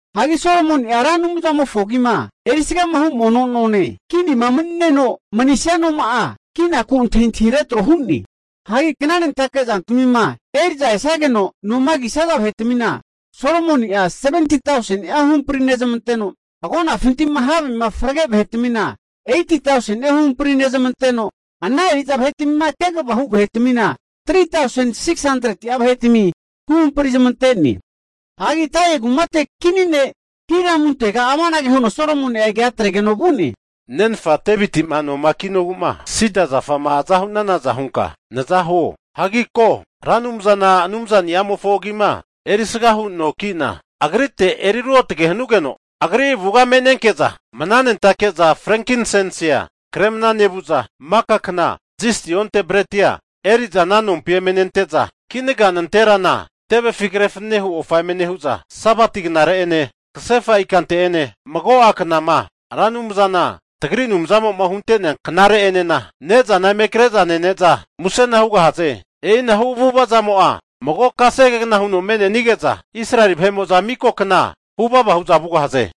Hagi Solomoni'a Ra Anumzamofo agima erisgahu mono none, kinima mani'neno manisia noma'a kinaku antahintahi retro hu'ne. Hagi knanentake zantamima eri'za esage'za noma kisaza vahetmina Solomoni'a, 70tauseni'a huhampri nezmanteno, agonafinti'ma havema frage vahetmina 80tauseni'a huhampri nezmanteno, ana eri'za vahetmima kegavama hu vahetmina 3tausen 600'a vahetami huhampri zamante'ne. Hagi Tairi kumate kini ne' Hiramuntega amanage huno Solomoni'a kea atregeno vu'ne. Nenfa Deviti'ma noma kinogu'ma sida zafa'ma aza hu'nanaza hunka naza huo. Hagi ko, Ra Anumzana Anumzani'amofo agima erisga hu nonki'na Agrite eri ruotge hanugeno, Agri avuga mnanentake'za frenkinsensia kremna nevu'za, maka kna zisti onte bretia eri'za ana nompi eme nente'za, kinaga nanterana tevefi kre fananehu ofa eme nehu'za, Sabati knare'ene, kasefa ikante'ene, mago'a knama Ra Anumzana tagri Anumzamo'ma hunte'nea knare'enena ne'zana eme kre'za nene'za musena hugahaze. E'ina hu avu'avazamo'a mago kasegegna huno me'nenige'za Israeli vahe'mo'za miko kna huvava hu'za vugahaze.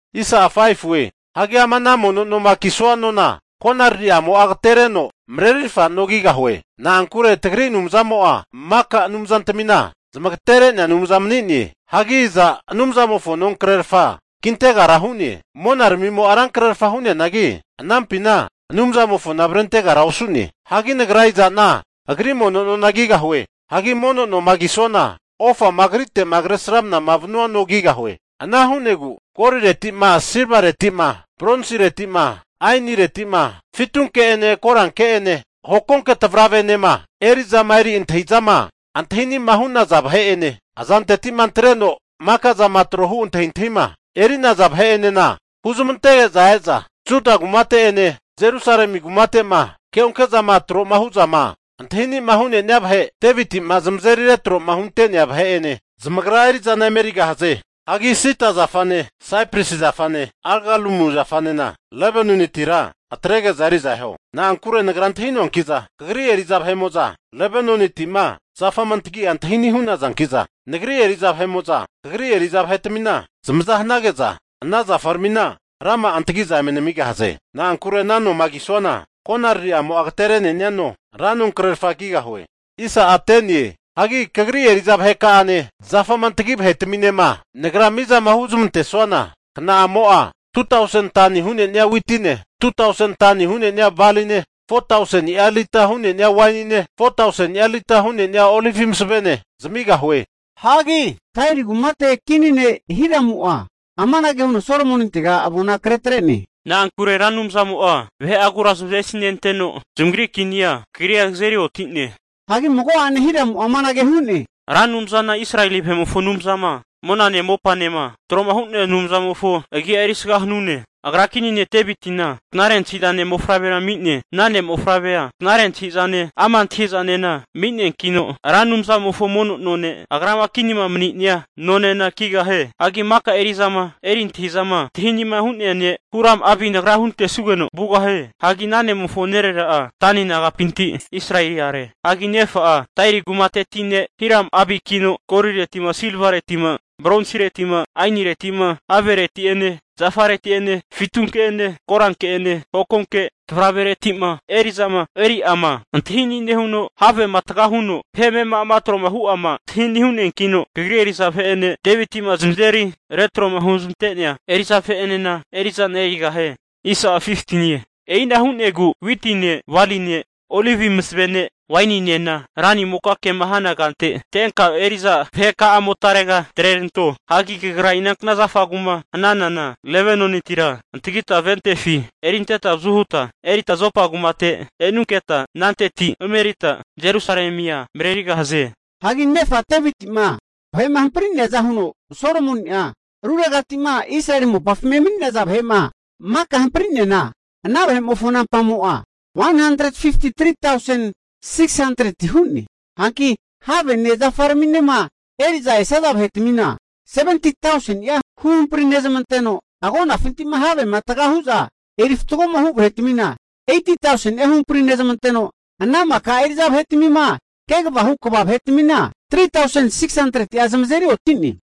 Hagi ama ana mono noma kisua nona konaririmo'a agatereno marerirfa no kigahue. Na'ankure tagri Anumzamo'a maka'a anumzatmina zmagatere'nea Anumza mani'ne. Hagi iza Anumzamofo nonkrerfa kintegara hu'ne? Monaramimo'a rankrerfa hu'neanagi anampina Anumzamofona avrentegara osu'ne. Hagi nagra iza'na Agri mono nona kigahue? Hagi mono noma kisuana, ofama Agritegama Kresramanama vanua no kigahue. Ana hu'negu golileti'ma, silvareti'ma, bronsiretima, ainireti'ma, fitunke'ene koranke'ene hokonke tavravere'enema eri'zama eri antahi'zama antahini'ma hu'naza vahe'ene, azanteti'ma antreno maka'zama tro'ma hu antahintahima eri'naza vahe'enena huzmantege'za e'za, Juda kumate'ene Jerusalemi kumate'ma keonke'zama tro hu'zama antahi ani'ma hu'nenia vahe Deviti'ma zamazeri retro'ma hunte'nea vahe'ene zamagra eri'zana emerigahaze. Hagi sida zafane, saipresi zafane, agalumu zafanena Lebanonitira atrege'za eri'za eho. Na'ankure nagra antahi'noanki'za kagri eri'za vahe'mo'za Lebanoniti'ma zafama antagi'a antahi ani' hu'nazanki'za, nagri eri'za vahe'mo'za kagri eri'za vahetmina zamaza hanage'za, ana zafaramina rama'a antagi'za eme namigahaze. Na'ankure ana noma kisuana konaririmo'a agaterene'nia no, ra nonkrerfa kigahue. Hagi kagri eri'za vaheka'ane, zafama antagi vahetaminema nagrama mizama huzmantesuana, kna'amo'a 2tausen tani hu'nenia witine, 2tausen tani hu'nenia baline, 400tauseni'a lita hu'nenia wainine, 400tauseni'a lita hu'nenia olivi masavene zamigahue. Hagi Tairi kumate kini ne' Hiramu'a amanage huno Solomonintega avona kre atre'ne. Na'ankure Ra Anumzamo'a vahe'agura zamavesinenteno zamagri kinia kagrira kazeri oti'ne. Hagi mago'ane Hiramu'a amanage hu'ne, Ra Anumzana Israeli vahe'mofo Anumzama monane mopanema tro'ma hu'nea Anumzamofo agi'a erisga hanune. Agra kini ne' Devitina knare antahi'zane mofavrea ami'ne. Ana ne' mofavrea knare antahi'zane, ama' antahi'zanena ami'neankino Ra Anumzamofo mono none, agrama kinima mani'nia nonena kigahie. Hagi maka eri'zama eri antahi'zama antahini'ma hu'nea ne' Huram-Abi nagra huntesugeno vugahie. Hagi ana ne'mofo nerera'a Dani nagapinti Israeli are, hagi nefa'a Tairi kumateti ne' Hiram-Abikino golireti'ma, silvareti'ma, bronsireti'ma, ainireti'ma, havereti'ene zafareti'ene fitunke'ene koranke'ene hokonke tavravereti'ma eri'zama eri'zante'ma antahi ani' nehuno, havema taga huno vahe amema'ama tro'ma hu'ama antahi' ani hu'neankino, kagri eri'za vahe'ene, Deviti'ma zamazeri retroma huzmante'nea eri'za vahe'enena eri'zana erigahie. E'ina hu'negu witine, baline, olivi masavene waininena ranimoka kema hana kante antenka eri'za vaheka'amotarega atreranto. Hagi kagra inankna zafagu'ma hananana Lebanonitira antagita, ventefi erinteta avazu huta erita Jopa kumate e'nunketa, ananteti emerita Jerusalemia marerigahaze. Hagi nefa Deviti'ma vahe'ma hampri'neaza huno Solomoni'a ruregati'ma Israeli mopafima emani'naza vahe'ma maka hampri'neana, ana vahe'mofo nampamo'a 153tausen 600ti hu'ne. Hanki havene zafaraminema eri'za esaza vahetamina 70tauseni'a huhampri nezmanteno, agonafinti'ma havema tagahu'za eri fatgoma hu vahetmina 80tauseni'a huhampri nezmanteno, ana maka eri'za vahetmima kegavama hu kva vahetmina 3tausen 600'a zamazeri oti'ne.